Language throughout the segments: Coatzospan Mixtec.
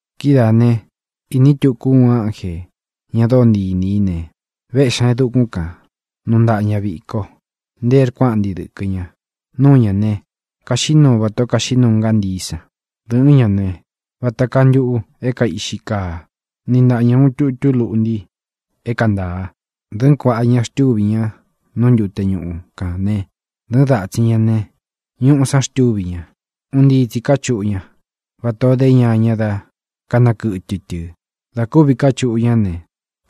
Kidáā ne, iní tuku ú uun ánjē, ña dóo ntii inī í ne, véꞌxi ñā e dukún kān. Nuu taꞌán ña viko; ntee rkuáꞌnti dɨkɨ̄ ña. Núu ñā ne, kaxiꞌí nuu vatā ó kaxiꞌí nuu ngántií san. Dɨ̄ꞌɨ́n ña ne, vata kaa ntuꞌu é kaiꞌxi kaa. Niꞌi ntaꞌa ña ūun tutu luꞌnti é kaa ntāa. Dɨ̄ꞌɨ́n kuaꞌa ña xtúvi ña nú ntute ñuꞌu kān né, dɨ̄ꞌɨ́n datsin ña ne, ñuꞌu san xtúvi ña. Un ntii tsi káchuꞌu ña, vatā ó de ñaña dá kanakɨtɨ tɨ̄. Dā kúvi kachuꞌu ñá ne,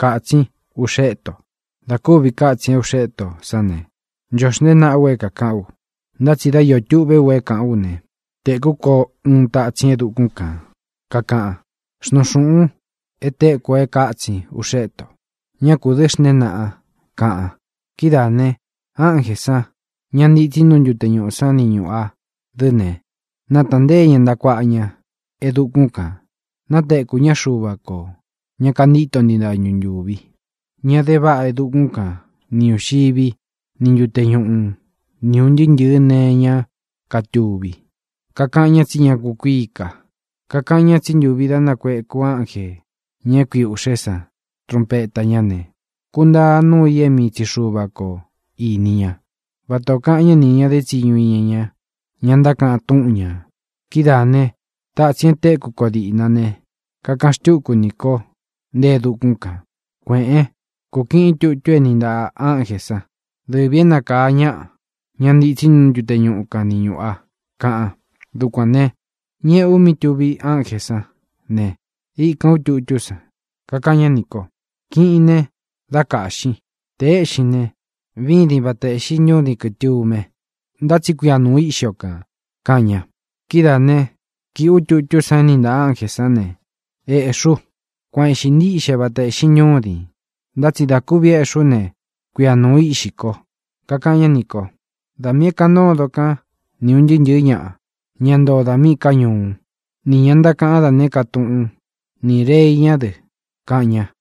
kātsín uꞌxé ito. Dā kúvi katsin é uꞌxé ito sán ne, ncho xnteé naꞌa u é kākaꞌan, ntá tsi dá iō tuꞌvé u é kaꞌu ú ne, tēkú ko uun tatsin e dukún kān, kakaꞌan: —Xnuun xūꞌun e téku o e kátsin uꞌxé ito. ¡Ña kū dɨ́ xnteen naꞌan! —kaꞌan. Kidáā ne, ánjē san, ña ntitsi nú ntute ñuꞌū sán ni ñūꞌu a dɨ́ ne, nátāꞌan ntée ña ntaꞌa kuāꞌa ña e dukún kān. Natékū ñá Xuva kō, ña kantíto ntii dañu ntūvi, ña de váꞌa e dukún kan ni ñūxiví ni ntute ñuꞌu ni ūn ntɨɨ́ ntɨ̄ɨ́ nee iñá katuví, kakaꞌan ña tsí ña kukuíi ka. Kakaꞌan ña tsí ntuvi dá nakuēku ánjē, ña é kui ūꞌxé san, trunpeta ñá ne, kuntaa núu i é mii tsi Xuva ko īni ñá, vata ō kaꞌan ñá nī ña dé tsiñu iña ña, ña ntákaꞌan túꞌun ñā. Kidáā ne, tátsīn e tékū ko díꞌna ne, kakaꞌan xtúku nī ko nte e dukún kān: —Kuēꞌén, kūkiꞌín tutu é niꞌi ntaꞌā ánjē sán, dɨvī é nakāa ñáꞌa, ña ntitsí nú ntute ñuꞌu kan ni ñūꞌu a —kaꞌan. Dukuān ne, ñéꞌē u mí tuvi ánjē sán ne, íkān ú tutú san. Kakaꞌan ñá nī kó: —Kiꞌin ne, dá kāꞌxin. Tē éꞌxin ne, vídin vata ēꞌxí ntúdin kɨ̄tume, ntá tsi kuia nūu íꞌxi o kān —kaꞌan ña. Kídaā né, kīꞌi ú tutú san é niꞌi ntaꞌā ánjē sán ne, ēꞌxí u. Kuan ēꞌxi ntíꞌxe vata ēꞌxi ntúdin, ntá tsi dā kúvi éꞌxi ú ne, kuia nūu íꞌxi ko. Kakaꞌan ñá nī kó: —Da miī é kāꞌan ntódon kán ni ūn ntɨɨ́ ntɨ̄ɨ́ ñaꞌa, ña ntoo dā míꞌī ká ñuú, nī ña ntákaꞌan dá nēé ka túꞌun, ni rēi ñá dɨ —kaꞌan ña.